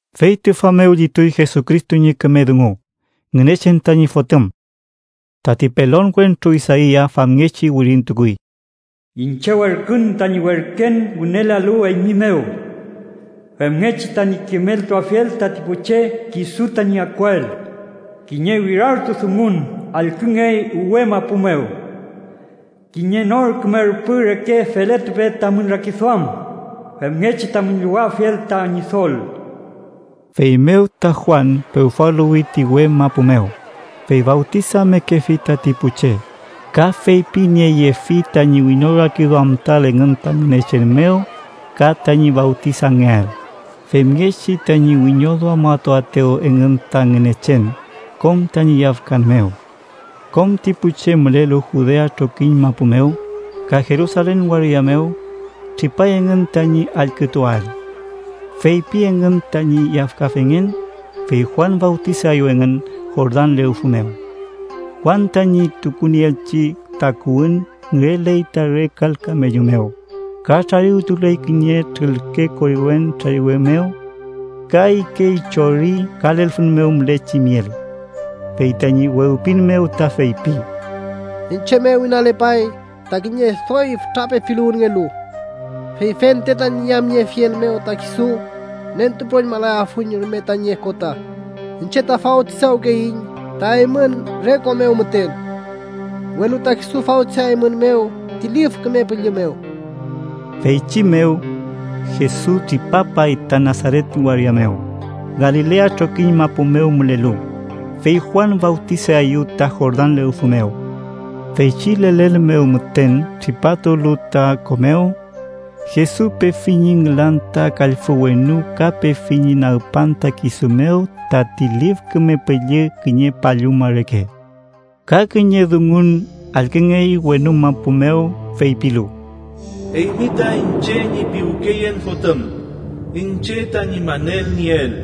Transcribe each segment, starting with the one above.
Fey tüfa mew llituy Jesucristo ñi küme dungu, Ngünechen tañi Fotüm. Tati pelon wentru Isaia famngechi wirintukuy: “Iñche werkün tañi werken wünelealu eymi mew femngechi tañi kimeltuafiel tati pu che kisu tañi akuael.” “Kiñe wirartu dungun allküngey uwe mapu mew: ‘Kiñe nor küme rüpü reke feletupe tamün rakiduam, femngechi tamün llowafiel ta Ñidol.’” Feymew ta Juan pewfaluwi ti uwe mapu mew, fey fawtisamekefi tati pu che, ka feypinieyefi tañi wiñorakiduamtuael engün ta Ngünechen mew ka tañi fawtisangeael, femngechi tañi wiñoduamatuaetew engün ta Ngünechen kom tañi yafkan mew. Kom ti pu che mülelu Judea trokiñ mapu mew, ka Jerusalen waria mew, tripay engün tañi allkütuael. Feypi engün tañi yafkafengen, fey Juan fawtisaeyew engün Jordan lewfü mew. Juan tañi tukunieelchi takuwün ngüreley ta re kal kamellu mew, ka trariwtuley kiñe trülke koriwen trariwe mew. Ka ikey chori ka lelfün mew mülechi miel. Fey tañi wewpin mew ta feypi: “Iñche mew inalepay ta kiñe doy fütra pepiluwünngelu, fey fente tañi yamniefiel mew ta kisu nentupüroñmalayafuiñ rume tañi okota. Iñche ta fawtisawkeyiñ ta eymün re ko mew müten, welu ta kisu fawtisayaeymünmew ti Lif Küme Püllü mew.” Feychi mew, Jesus tripapay ta Nasaret waria mew, Galilea trokiñ mapu mew mülelu, fey Juan fawtisaeyew ta Jordan lewfü mew. Feychi lelen mew müten tripatulu ta ko mew, Jesus pefi ñi nülan ta kallfü wenu ka pefi ñi nagpan ta kisu mew tati Lif Küme Püllü kiñe palluma reke. Ka kiñe dungun allküngey wenu mapu mew feypilu: “Eymi ta iñche ñi piwkeyen Fotüm, iñche tañi manelnieel.”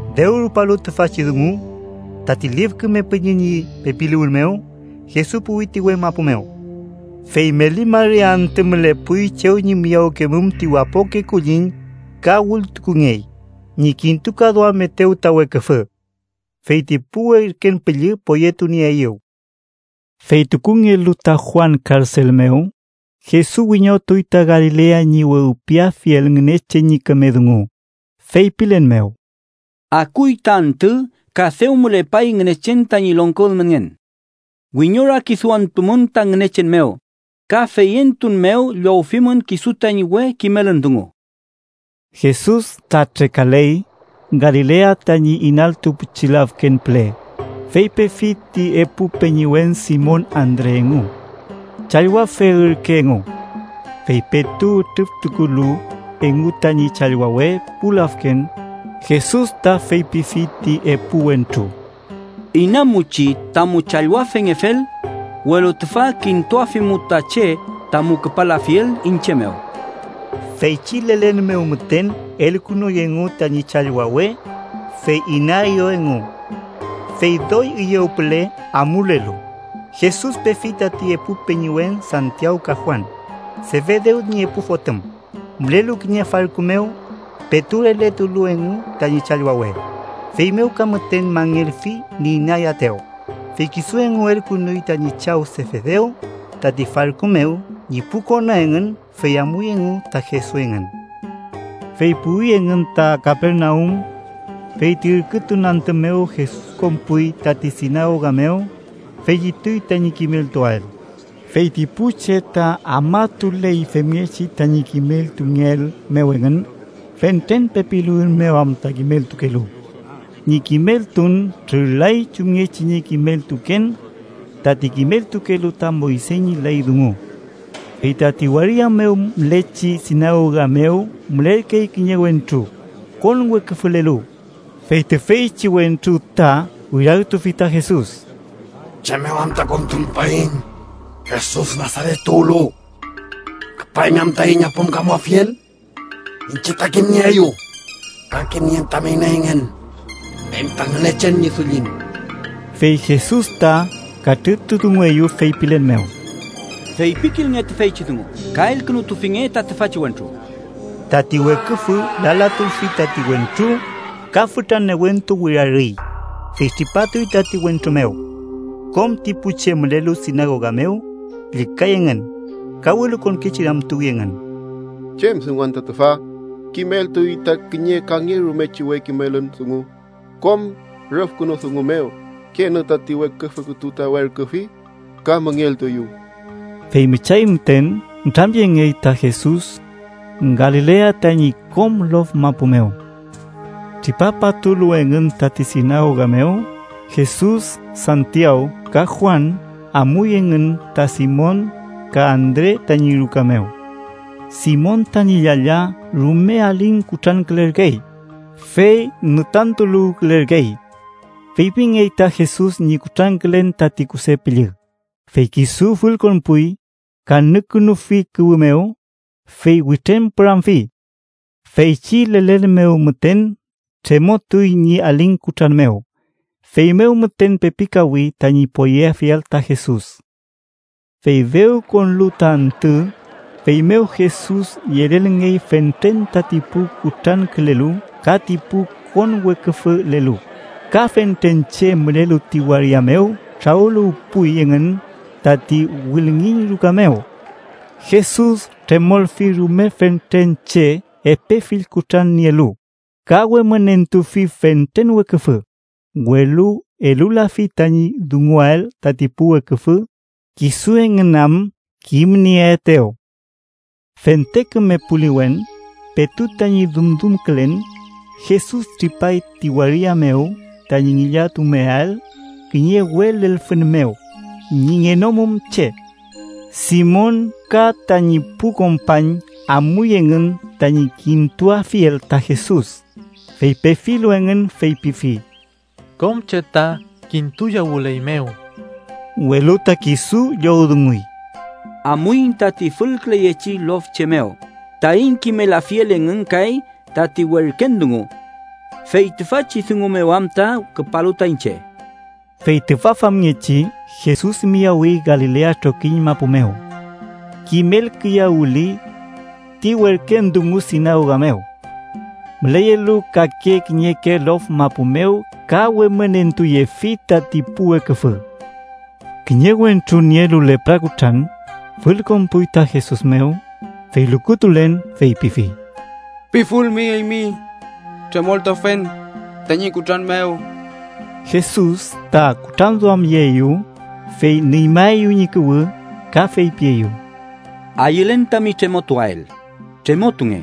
Dew rupalu tüfachi dungu, tati Lif Küme Püllü ñi pepiluwün mew, Jesus puwi ti uwe mapu mew. Fey meli mari antü mülepuy chew ñi miyawentukemum ti wapoke kulliñ ka wültukungey ñi kintukaduamaetew ta Weküfü. Fey ti pu werken püllü poyetunieeyew. Fey tukungelu ta Juan karsel mew, Jesus wiñotuy ta Galilea ñi wewpiafiel Ngünechen ñi küme dungu, feypilen mew: “Akuy ta antü, ka dew mülepay Ngünechen tañi longko ülmenngen. Wiñorakiduamtumün ta Ngünechen mew, ka feyentun mew llowfimün kisu tañi we kimelün dungu.” Jesus ta trekaley Galilea tañi inaltu pichi lafken püle, fey pefi ti epu peñiwen Simon Andre engu. Challwafe ürke engu. Fey petu ütrüftukulu engu tañi challwawe pu lafken, Jesus ta feypifi ti epu wentru: —Inamuchi, tamu challwafengefel, welu tüfa kintuafimu ta che tamu küpalafiel iñche mew. Feychi lelen mew müten elkünuy engu tañi challwawe, fey inaeyew engu. Fey doy üyew püle amulelu, Jesus pefi tati epu peñiwen Santiaw ka Juan, Sefedew ñi epu fotüm, mülelu kiñe farku mew petu raletulu engu tañi challwawe. Feymew ka müten mangelfi ñi inayaetew, fey kisu engu elkünuy tañi chaw Sefedew tati farku mew ñi pu kona engün, fey amuy engu ta Jesus engün. Fey puwi engün ta Kapernaum. Fey ti ürkütun antü mew Jesus konpuy tati sinagoga mew, fey llituy tañi kimeltuael. Fey ti pu che ta afmatuley femngechi tañi kimeltungeel mew engün, fentren pepiluwün mew am kimeltumekelu. Ñi kimeltun trürlay chumngechi ñi kimeltuken tati kimeltukelu ta Moyse ñi ley dungu. Fey tati waria mew mülechi sinagoga mew mülerkey kiñe wentru konweküfülelu, fey tüfeychi wentru ta wirartufi ta Jesus: —¿Chem mew anta kontumupaiñ, Jesus Nasaret tuwlu? ¿Küpaymi am taiñ apümkamuafiel? Iñche ta kimnieeyu, ka kimnien tami ineyngen. Eymi ta Ngünechen ñi dullin. Fey Jesus ta katrütudungueyew feypilen mew: —¡Feypikilnge tüfeychi dungu ka elkünutufinge ta tüfachi wentru! Tati weküfü lalatulfi tati wentru, ka fütra newentu wirarüy, fey tripatuy tati wentru mew. Kom ti pu che mülelu sinagoga mew llükay engün, ka welukonkechi ramtuwi engün: “¿Chem dungu anta tüfa? ¡Kimeltuy ta kiñe kangerumechi we kimelün dungu kom rüfkünu dungu mew! ¡Kenü tati weküfü kütu ta werküfi, ka müngeltueyew!” Fey müchay müten nütramyengey ta Jesus Galilea tañi kom lof mapu mew. Tripapatulu engün tati sinagoga mew, Jesus, Santiaw ka Juan amuy engün ta Simon ka Andre tañi ruka mew. Simon tañi llalla rume aling kutrankülerkey fey ngütantuluwkülerkey. Feypingey ta Jesus ñi kutrankülen tati kuse püllü, fey kisu fülkonpuy, ka nükünufi kuwü mew, fey witrañpüramfi. Feychi lelen mew müten tremotuy ñi aling kutran mew, feymew müten pepikawi tañi poyeafiel ta Jesus. Fey dew konlu ta antü, feymew Jesus yelelngey fentren tati pu kutrankülelu ka ti pu konweküfülelu, ka fentren che mülelu ti waria mew trawüluwpuy engün tati wülngiñ ruka mew. Jesus tremolfi rume fentren che epe fill kutran nielu, ka wemünentufi fentren weküfü, welu elulafi tañi dunguael tati pu weküfü, kisu engün am kimnieetew. Fente küme puliwen, petu tañi dumdumkülen, Jesus tripay ti waria mew tañi ngillatumeael kiñe uwe lelfün mew ñi ngenomum che. Simon ka tañi pu kompañ amuy engün tañi kintuafiel ta Jesus, fey pefilu engün feypifi: —Kom che ta kintuyawüleymew. Welu ta kisu llowdunguy: —Amuiñ tati fülküleyechi lof che mew taiñ kimelafiel engün kay tati werken dungu. Fey tüfachi dungu mew am ta küpalu ta iñche. Fey tüfa famngechi Jesus miyawi Galilea trokiñ mapu mew. Kimelkiyawüli ti werken dungu sinagoga mew müleyelu kake kiñeke lof mapu mew ka wemünentuyefi tati pu weküfü. Kiñe wentru nielu lepra kutran fülkonpuy ta Jesus mew, fey lukutulen feypifi: —Pifulmi eymi, tremoltuafen tañi kutran mew. Jesus ta kutranduamyeeyew, fey nüñmaeyew ñi kuwü ka feypieyew: —Ayülen tami tremotuael. ¡Tremotunge!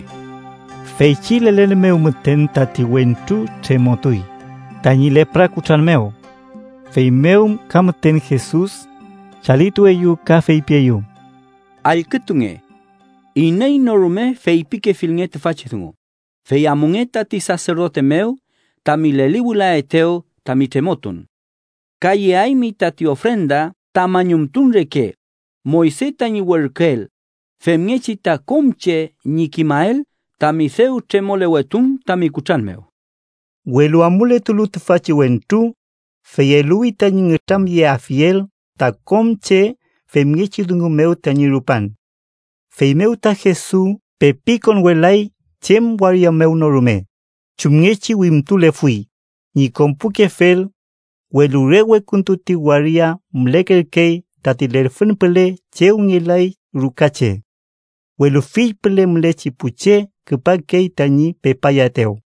Feychi lelen mew müten tati wentru tremotuy tañi lepra kutran mew. Feymew ka müten Jesus chalitueyew, ka feypieyew: —Allkütunge. Iney no rume feypikefilnge tüfachi dungu, fey amunge tati saserdote mew tami leliwülaetew tami tremotun. Ka yeaymi tati ofrenda ta mañumtun reke, Moyse tañi werküel, femngechi ta kom che ñi kimael tami dew tremolewetun tami kutran mew. Welu amuletulu tüfachi wentru, fey eluwi tañi nütramyelafiel ta kom che femngechi dungu mew tañi rupan. Feymew ta Jesus pepi konwelay chem waria mew no rume chumngechi wimtulefuy ñi konpukefel, welu re wekuntu ti waria mülekerkey tati lelfün püle chew ngelay ruka che. Welu fill püle mülechi pu che küpakey tañi pepayaetew.